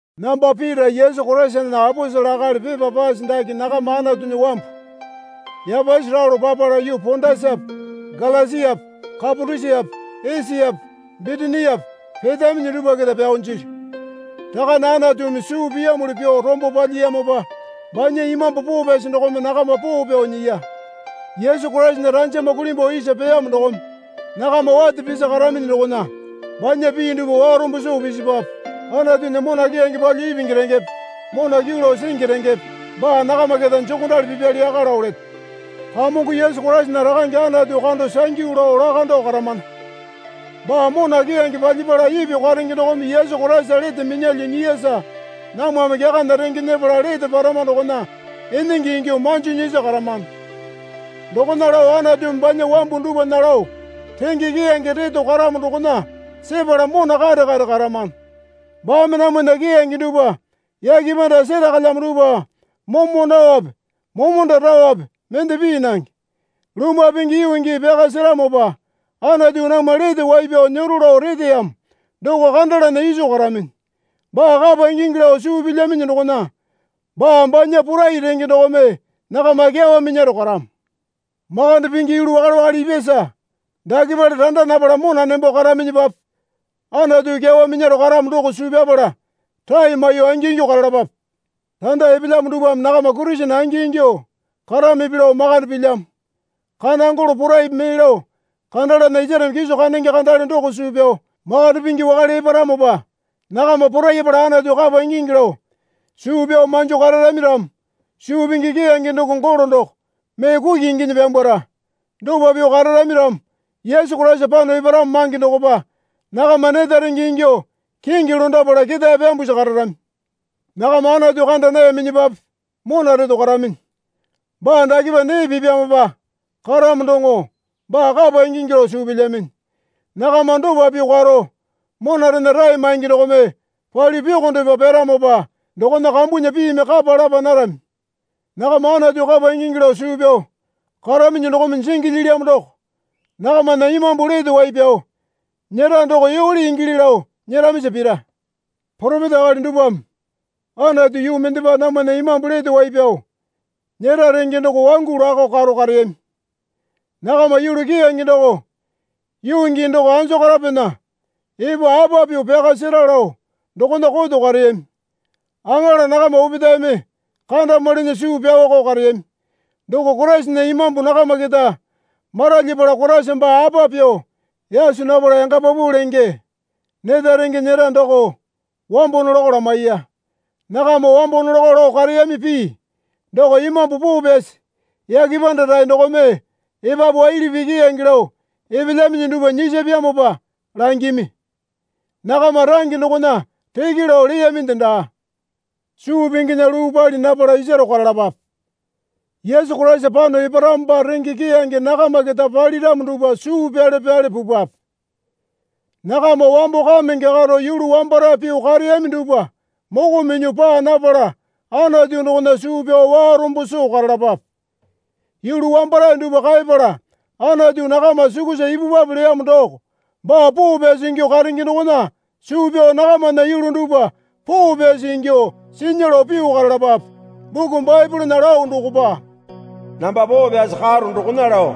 Namba Pita Yesu Koraisana aposele akali pepa pase dake nakama Anatunya wambu yapasi ralo papala yuu Pondasape Galasiape Kapatosiape Esiape Bitiniape petaminyi dupwa keta pyao jilyu. Rakane Anatumi suu piyamuli pyuo rombo palyiyamopa banya Imambu Poo Pyasi dokome nakama poo pyao nyiya. Yesu Koraisana ranjama kulimbuo isa peyamo dokome nakama wate pisi karaminyi dokona banya pii dupwa warombo soo pisipwape. Anatunya mona keyange palyuo ipingi rengepe mona kyuu lao singi rengepe baa nakama keta jokondali pipyali yaka lao leto. Kamongo Yesu Koraisana Rakange Anatu kando sangyu lao lakando karamana. Baa mona keyange palyapala ipyuo karenge dokome Yesu Koraisa lete minyalyuo nyiyasa namwame kyakana renge nyepala lete parama dokona enenge ingyuo manjo nyisi karamano. Dokona lao Anatumi banya wambu dupwana lao renge keyange reto karamo dokona sepala mona kare kare karamano. Baame namwana keyange dupwa yake panda serakalyamo dupwa momo naope momonda raope mende pii nange. Lumwa pingi yuu gii pyaka seramopa Anatu namwa lete wai pyao nyero lao reteyamo doko kandalana iso karaminyi. Baa kapa ingingi lao suu pilyaminyi dokona baa banya porai renge dokome nakama kyawa minyaro karamo. Makande pingi yulu wakale wakale ipyasa dakepale randa napala mona nembo karaminyipape Anatu kyawa minyaro karamo doko suu pyapala rae maiyuo angingyuo karalapape. Randa epelyamo dupwame nakama Kurisene angingyuo karamipi lao makande pilyamo. Kana golo poraipi mee lao kandalana isareme kiso kandenge kandale doko suu pyao makande pingi wakale eparamopa nakama porayapala Anatu kapa ingingi lao suu pyao manjo kararami ramo suu pingi keyange doko golo doko mee kuki inginyi pyambwara. Dopa pyuo kararami ramo Yesu Koraisa pano eparamo mange dokopa nakama neta renge ingyuo kingi londapala ketae pyambusi kararami. Nakama Anatu kanda nayaminyipape mona reto karaminyi. Baa dakepa nee pipyamopa karamo doŋo baa kapa ingingi lao suu pilyaminyi. Nakama dopa pyuo karo monarena rae maingi dokome palyuo pyokondepa pyaramopa dokona kambunya piimi kapa lapa narami. Nakama Anatu kapa ingingi lao suu pyao karaminyi dokome jingi lyilyamo doko nakamana imambu lete wai pyao nyera doko yole ingili lao nyeramisa pira. Poropeta akali dupwame Anatu yuu mendepa namwana imambu lete wai pyao nyera renge doko wangu lakao karo kareyami. Nakama yulu keyange doko yuu gii doko anjokorapena epo, apa pyuo pyaka sera lao dokona koto kareyami. Aŋala nakama opetaeme kandamwalinya suu pyaoko kareyami. Doko Koraisana Imambu nakama keta maralyapala Koraisa baa apa pyuo yaso napala yanga paupau lenge neta renge nyera doko wambo nolakao lamaiya. Nakama wambo nolakao lao kareyami pii doko Imambu Poo Pyasi yake panda rae dokome epapu waili pii keyange lao epelyaminyi dupwa nyisapyamopa langimi. Nakama range dokona reke lao leyaminde daa. Suu pinginya luu pali napala isaro karalapape. Yesu Koraisa pano eparamopa renge keyange nakama keta paliramo dupwa suu pyale pyale pupwape. Nakama wambo kamenge karo yulu wambarae pyuo kareyami dupwa moko minyuo paa napala Anatu dokona suu pyao warombo soo karalapape. Yulu wambarae dupwa kaeyapala Anatu nakama sukusa ipupwape leyamo doko baa poo pyasi ingyuo karenge dokona suu pyao nakamana yulu dupwa poo pyasi ingyuo sinya lao pyuo karalapape. Buku Baepolena lao dokopa, Namba poo pyasi karo dokona lao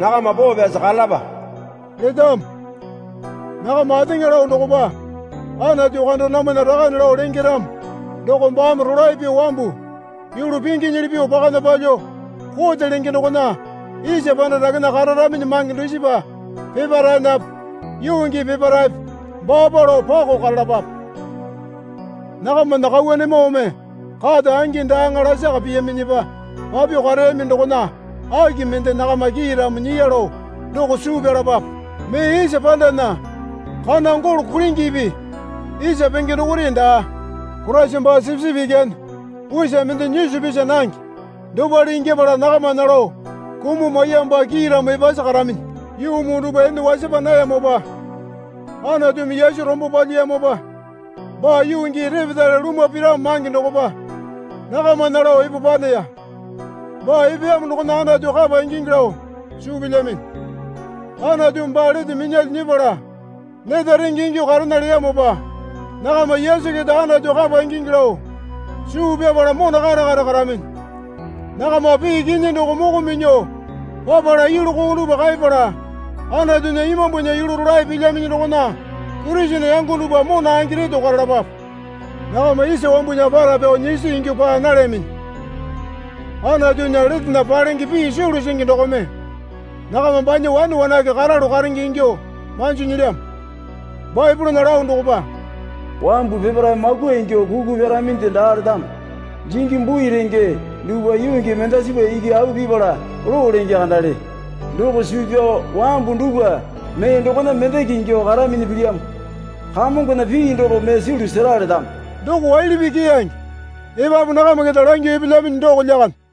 nakama poo pyasi karalapa letamo. Nakama ateŋa lao dokopa Anatu kando namwana Rakane lao lenge ramo doko baame rolae pyuo wambu yulu pinginyili pyuo pakana palyuo kote lenge dokona isa panda dakena kararaminyi mange dusipa peparaenape yuu gii peparaepe baapa lao pako karalapape. Nakamana kauwanemoome kata angi daaŋa lasaka piyaminyipa papyuo kareyami dokona aki mende nakama kiiramo nyiya lao doko suu pyalapape. Mee isa pandana kana golo kulingipi isa penge dokore daa. Koraisa baa sipisipi ikyane usa mende nyisa pisa nange dopale ingyapala nakamana lao kumuo maiyamopa kiiramo epasi karaminyi. Yuu muu dupwa ene wasapa nayamopa Anatumi Yesu rombo palyiyamopa baa yuu gii repetale lumwa piramo mange dokopa nakamana lao epo paneya. Baa epeyamo dokona Anatu kapa ingingi lao suu pilyminyi. Anatumi baa lete minyalyuo nyepala neta renge ingyuo karena leyamopa nakama Yesu keta Anatu kapa ingingi lao suu pyapala mona kare kare karaminyi. Nakama pii kinyi doko moko minyuo papala yulu koo dupwa kaeyapala Anatunya Imambunya yulu rolae pilyaminyi dokona Kurisene yango dupwa mona angi reto karalapape. Nakama isa wambunya para pyao nyisi ingyuo paa nalyaminyi. Anatunya letena palenge pii sulu singi dokome nakama banya wane wanake karalu karenge ingyuo manjo nyilyamo. Baepolena lao dokopa, Wambu peparae makwa ingyuo kuku pyaraminde daa letamo. Jingi bui renge dupwa yuu gii mendasipa iki au pipala loo lenge kandale. Doko suu pyao wambu dupwa mee dokona mendeke ingyuo karaminyi pilyamo. Kamongona pii doko mee sulu sera letamo. Doko waili pii keyange epapu nakama keta langyuo epelyaminyi doko lyakande.